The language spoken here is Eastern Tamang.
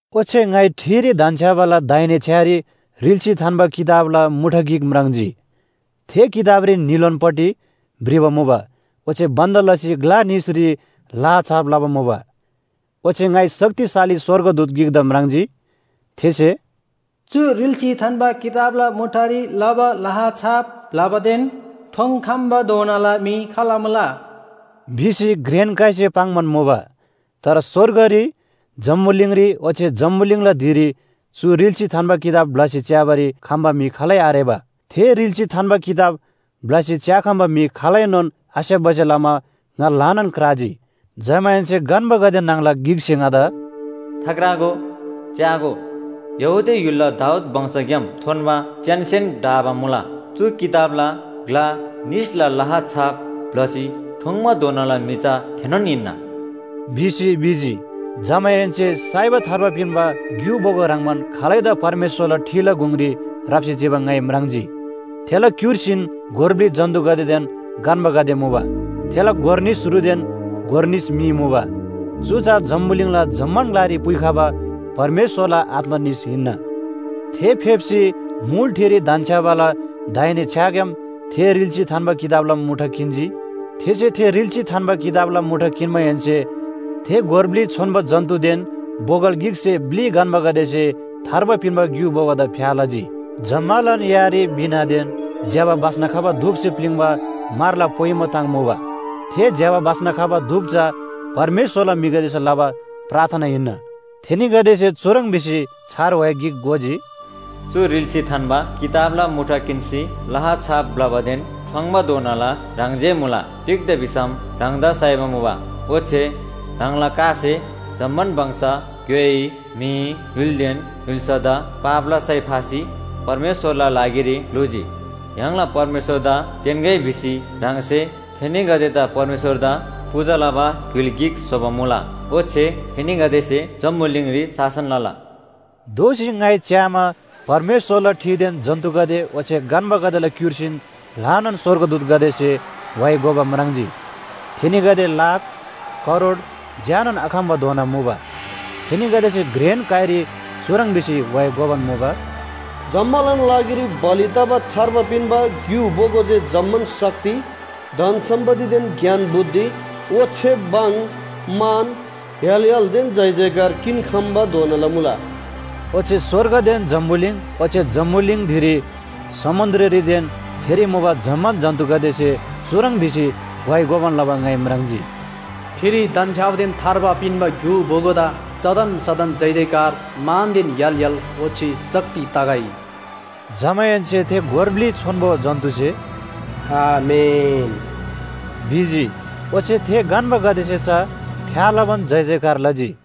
ओच्‍छे ङाइ ठिरी धन्‍छ्‌याबाला दाहिने छ्‌यारी रिल्‍सी थान्‍बा किताबला मुठा गिक म्राङ्जी। थे किताबरी न्‍हीलोनपट्टि भ्रिबा मुबा ओच्‍छे बन्‍द लसी ग्‍ला निसरी लाहा छाप लबा मुबा। ओच्‍छे ङाइ शक्तिशाली स्‍वर्गदूत गिकदा म्राङ्जी। थेसे “चु रिल्‍सी थान्‍बा किताबला मुठारी लबा लाहा छाप ब्‍लबादेन ठोङ्‌खम्‍बाधोनाला म्‍हि खाल मुला?” भिसी घ्रेन काइसे पाङ्‌बान मुबा। तर स्‍वर्गरी, जम्‍बुलिङरी ओच्‍छे जम्‍बुलिङला धिरी चु रिल्‍सी थान्‍बा किताब ब्‍लसी च्‍याबारी खम्‍बा म्‍हि खालै आरेबा। थे रिल्‍सी थान्‍बा किताब ब्‍लसी च्‍याखम्‍बा म्‍हि खालैनोन आस्‍याप्‍बासे लमा ङा ल्‍हानान क्राजी। जमाहेन्‍से गन्‍बागदे न्‍हङला गिकसे ङादा “थाक्रागो, च्‍यागो, यहूदा य्‍हुलला दाऊद वंशग्‍याम थोन्‍बा च्‍यानसेन ढाबा मुला। चु किताबला ग्‍ला निसला लाहा छाप ब्‍लसी ठोङ्‌बाधोनाला म्‍हि चा थेनोन हिन्‍ना” भिसी भिजी। जमाहेन्‍से साइबा थार्बा पिन्‍बा ग्‍यु बोगो ह्रङ्‌बान खालैदा परमेश्‍वरला ठिला गुङरी राप्‍सी चिबा ङाइ म्राङ्जी। थेला क्‍युर्सीन गोर ब्‍लि जन्‍तुगदेदेन गन्‍बागदे मुबा। थेला गोर निस रुदेन गोर निस मी मुबा। चु चा जम्‍बुलिङला जम्‍मान ग्‍लारी पुइखबा परमेश्‍वरला आत्‍मा निस हिन्‍ना। थे फेप्‍सी मुल ठिरी धन्‍छ्‌याबाला दाहिने छ्‌याग्‍याम थे रिल्‍सी थान्‍बा किताबला मुठा किन्‍जी। थेसे थे रिल्‍सी थान्‍बा किताबला मुठा किन्‍माहेन्‍से थे गोर ब्‍लि छोन्‍बो जन्‍तुदेन बोगल गिकसे ब्‍लि गन्‍बागदेसे थार्बा पिन्‍बा ग्‍यु बोगोदा फ्‍या लजी। जम्‍मालान यारी वीणादेन ज्‍यबा बास्‍ना खबा धूपसे प्‍लिङ्बा म्‍हरला पोइमो ताङ मुबा। थे ज्‍यबा बास्‍ना खबा धूप चा परमेश्‍वरला म्‍हिगदेसे लबा प्रार्थना हिन्‍ना। थेनीगदेसे चुह्रङ् भिसी छार व्‍हाइ गिक गोजी, “चु रिल्‍सी थान्‍बा किताबला मुठा किन्‍सी लाहा छाप ब्‍लबादेन ठोङ्‌बाधोनाला ह्राङ जे मुला। तिग्‍दा भिसम ह्राङदा साइबा मुबा, ओच्‍छे ह्राङला कासे जम्‍मान वंश, ग्‍योइ, म्‍हि, य्‍हुलदेन य्‍हुल्‍सादा पापला सय फासी परमेश्‍वरला लागिरी ग्‍लुजी। य्‍हाङला परमेश्‍वरदा तेन्‍गै भिसी ह्राङसे थेनीगदेदा परमेश्‍वरदा पूजा लबा य्‍हुल गिक स्‍होबा मुला। ओच्‍छे थेनीगदेसे जम्‍बुलिङरी शासन लला।” दोःसी ङाइ च्‍यामा, परमेश्‍वरला ठिदेन जन्‍तुगदे ओच्‍छे गन्‍बागदेला क्‍युर्सीन ल्‍हानान स्‍वर्गदूतगदेसे व्‍हाइ गोबा म्राङ्जी। थेनीगदे लाख, करोड झ्‍यानोन आखम्‍बाधोना मुबा। थेनीगदेसे घ्रेन काइरी चुह्रङ् भिसी व्‍हाइ गोबान मुबा, “जम्‍मालान लागिरी बलि तबा थार्बा पिन्‍बा ग्‍यु बोगो जे जम्‍मान शक्ति, धन सम्‍पत्तिदेन ज्ञान बुद्धि, ओच्‍छे भङ, मान, य्‍हाल य्‍हालदेन जयजयकार किन्‍खम्‍बाधोनाला मुला।” ओच्‍छे स्‍वर्गदेन जम्‍बुलिङ ओच्‍छे जम्‍बुलिङ धिरी, समुन्‍द्ररीदेन थेरी मुबा जम्‍मान जन्‍तुगदेसे चुह्रङ् भिसी व्‍हाइ गोबान लबा ङाइ म्राङ्जी। “ठिरी धन्‍छ्‌याबादेन थार्बा पिन्‍बा ग्‍यु बोगोदा सदन सदन जयजयकार, मानदेन य्‍हाल य्‍हाल, ओच्‍छे शक्ति तगै।” जमाहेन्‍से थे गोर ब्‍लि छोन्‍बो जन्‍तुसे “आमेन” भिजी। ओच्‍छे थे गन्‍बागदेसे चा फ्‍या लबान जयजयकार लजी।